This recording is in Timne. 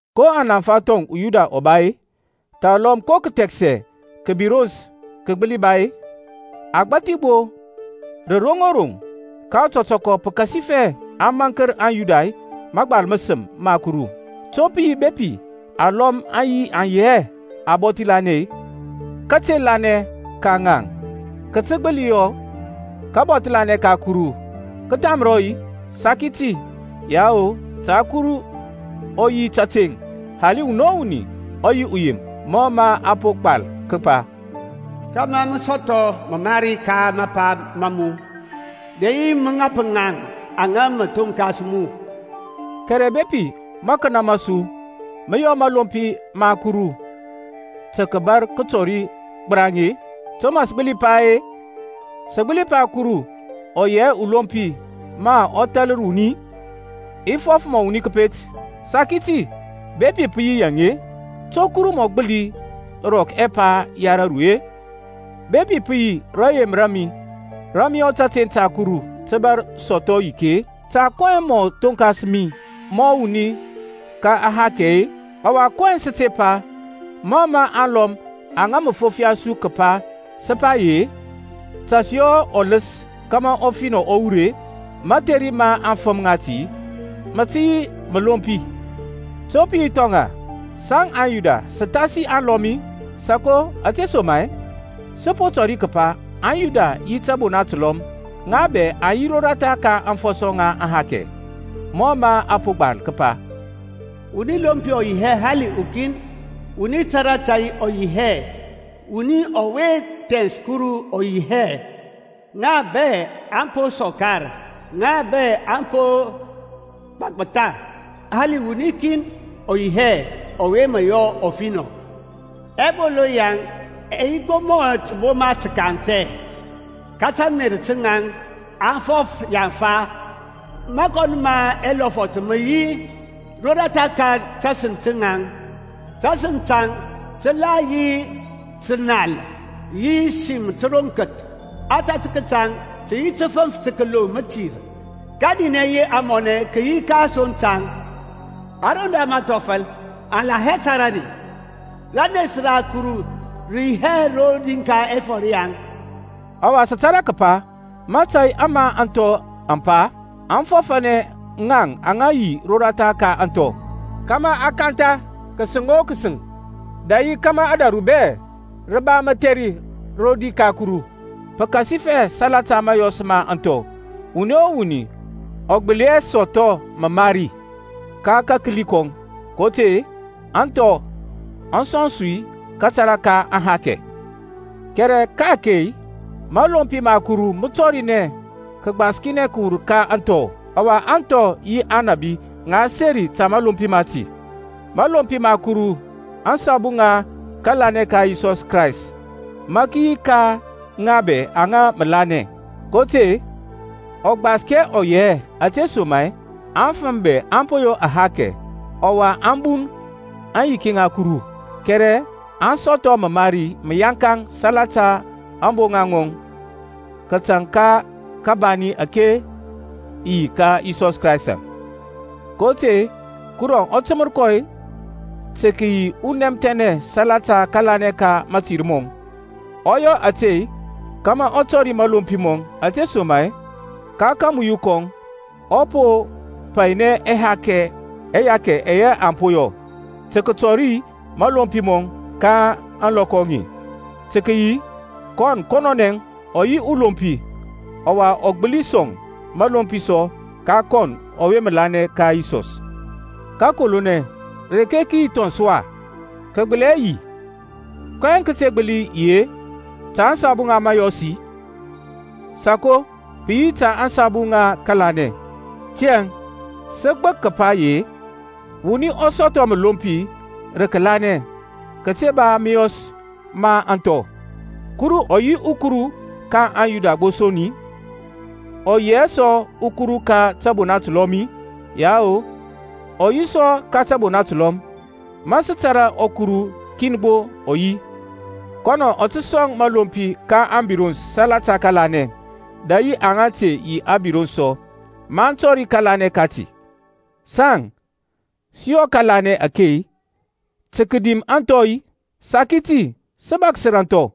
Ko anaŋfa thɔŋ uYuda ɔ ba-e? Thalɔm ko kəthɛksɛ kəbirons kə gbəli ba-e? Agbathi gbo rə roŋ o roŋ. Ka ɔtɔtɔkɔ, pəkasifɛ a maŋkər anYuda mȧgbal məsəm ma Kuru. To pə yi bepi alɔm aŋ yi hɛ abɔthi lanɛ-e? Kate lanɛ ka ŋaŋ kə tə gbəli yɔ kabɔthi lanɛ ka Kuru kə thamrɔ-i? Saki ti; yao, ta Kuru ɔ yi təteŋ hali wuni o wuni ɔ yi uyem, mɔ mə a po gbal kəpa, Kama mə sɔthɔ məmari ka mapa ma mu, Dɛ yi mə ŋap ŋaŋ aŋa mə thonkas mu. Kɛrɛ bepi makənə ma su mə yɔ mȧlompi ma Kuru tə kəbar tɔri gbəraŋ-e, to mə sə gbəli pa-e? Sə gbəli pa Kuru ɔ yi hɛ ulompi ma ɔ thalər wuni-i? (I fɔf mɔ wuni kəpet). Saki ti. Bepi pə yi yaŋ-e, to Kuru mɔ gbəli rɔk ɛpa ya raru-e? Bepi pə yi rayem ra mi rə mə yɔ tȧteŋ ta Kuru tə bȧr sɔthɔ yiki-e, ta kɔyɛŋ mɔ thonkas mi mɔ wuni ka ahakɛ-e? Ɔwa kɔyɛŋ sə te pa, (mɔ mə alɔm aŋa mə fofiya su kəpa sə pa ye), Ta sə yɔ ɔləs kȧmȧ ɔfinɔ ɔ wur-e? Mȧtheri ma aŋfəm ŋati mə tə yi məlompi. To pə yi thɔŋ-a? Saŋ aYuda sə thasi aŋlɔm-i? Sako; ȧtesoma-e sə po tɔri kəpa aŋYuda yi tȧbona təlɔm, ŋa bɛ aŋ yi roratha ka aŋfɔsɔ ŋa ahakɛ. Mɔ mȧ a po gbal kəpa, Wuni lompi ɔ yi hɛ hali ukin. Wuni tȧrȧ tȧy ɔ yi hɛ, Wuni ɔwe thɛns Kuru ɔ yi hɛ. Ŋa bɛ aŋ po sɔkar, ŋa bɛ aŋ po gbɔgbətha, Hali wuni kin ɔ yi hɛ ɔwe mə yɔ ɔfinɔ. Ɛbolo yaŋ ɛ yi gbo mɔ təboma təkanthɛ, Ka tȧmer taŋ aŋ fɔf yaŋfa. Mȧkɔn ma ɛlɔfɔth mə yi roratha ka tasəŋ taŋ; Tasəŋ taŋ tə la yi tənal yi sim təroŋkəth. Ȧtȧtək taŋ tə yi təfəŋf tə kəloŋ mətir. Kȧdinɛ yi amɔnɛ kə yi ka asoŋ taŋ, Ȧroŋ da mȧthɔfəl, aŋ la hɛ tȧrȧ ri. Ranes ra Kuru rə yi hɛ rodi ka ɛfɔr yaŋ. Ɔwa sə tȧrȧ kəpa mȧtȧy ama ȧŋthɔ aŋ pa, aŋ fɔfȧnɛ ŋaŋ aŋa yi roratha ka ȧŋthɔ, kȧmȧ a kantha kəsəŋ o kəsəŋ, dɛ yi kȧmȧ ȧdȧru bɛ rə ba mətheri rodi ka Kuru. Pəkasifɛ salata mȧyɔs ma ȧŋthɔ wuni o wuni ɔ gbəli hɛ sɔthɔ məmari. Ka kakəli kɔŋ; kotȧy-e ȧŋthɔ aŋ sɔŋ su kȧtȧrȧ ka aŋhakɛ Kɛrɛ ka-ake mȧlompi ma Kuru mə tɔrinɛ kəgbaskinɛ kəwur ka ȧŋthɔ, ɔwa ȧŋthɔ yi Aŋnȧbi ŋa seri ta mȧlompi mati. Mȧlompi ma Kuru asabu ŋa kȧlanɛ ka Yisɔs Kraystȧŋ mə yi ka ŋa bɛ aŋa mə lanɛ. kotȧy-e ɔgbaskɛ ɔ yi hɛ, ȧtesoma-e afəm bɛ aŋ po yɔ ahakɛ, ɔwa aŋ bun aŋyiki ŋa Kuru, kɛrɛ aŋ sɔthɔ məmari məyaŋkaŋ salata ȧŋboŋa ŋɔŋ kətaŋ ka kabani ȧke yi ka Yisɔs Kraystȧŋ. kotȧy-e Kuru ɔ təmər kɔ tə kəyi unɛmthɛnɛ salata kȧlanɛ ka mȧtir mɔŋ. Ɔ yɔ ȧte kȧmȧ ɔ tɔri mȧlompi mɔŋ, ȧtesoma-e ka kamuyu kɔŋ ɔ po painɛ ɛhakɛ ɛyɛ aŋ po yɔ, tə kətɔri mȧlompi mɔŋ ka ȧŋlɔkɔ aŋe, tə kəyi, kɔn kɔnɔnɛ ɔ yi ulompi, ɔwa ɔ gbəli sɔŋ məlompi sɔ ka kɔn ɔwe mə lanɛ ka Yisɔs. Kəkolonɛ, reke kə yi thɔŋ sɔ-a? Kə gbəli hɛ yi. Kɔyɛŋ kə te gbəli yi-e? Ta asabu ŋa mȧyɔs-i? Sako, pə yi ta ȧŋsabu ŋa kȧlanɛ. Tiyȧŋ sə gbək kəpa ye, wuni ɔ sɔthɔ məlompi rə kəlanɛ kəte ba mȧyɔs ma ȧŋthɔ. Kuru ɔ yi ɔKuru ka aŋYuda gbo son-i? Ɔ yi hɛ sɔ ɔKuru ka tȧbona təlɔm-i? Yao, ɔ yi sɔ ka tȧbona təlɔm. Ma sə tȧrȧ ɔKuru kin gbo ɔ yi, kɔnɔ ɔ tə sɔŋ məlompi ka ȧŋbirons salata kȧlanɛ, dɛ yi aŋa te yi abirons sɔ, maŋ tɔri kȧlanɛ kati. Saŋ sə yɔ kȧlanɛ ake tə kədim anthɔ-i? Saki ti! Sə bȧksər ȧŋthɔ.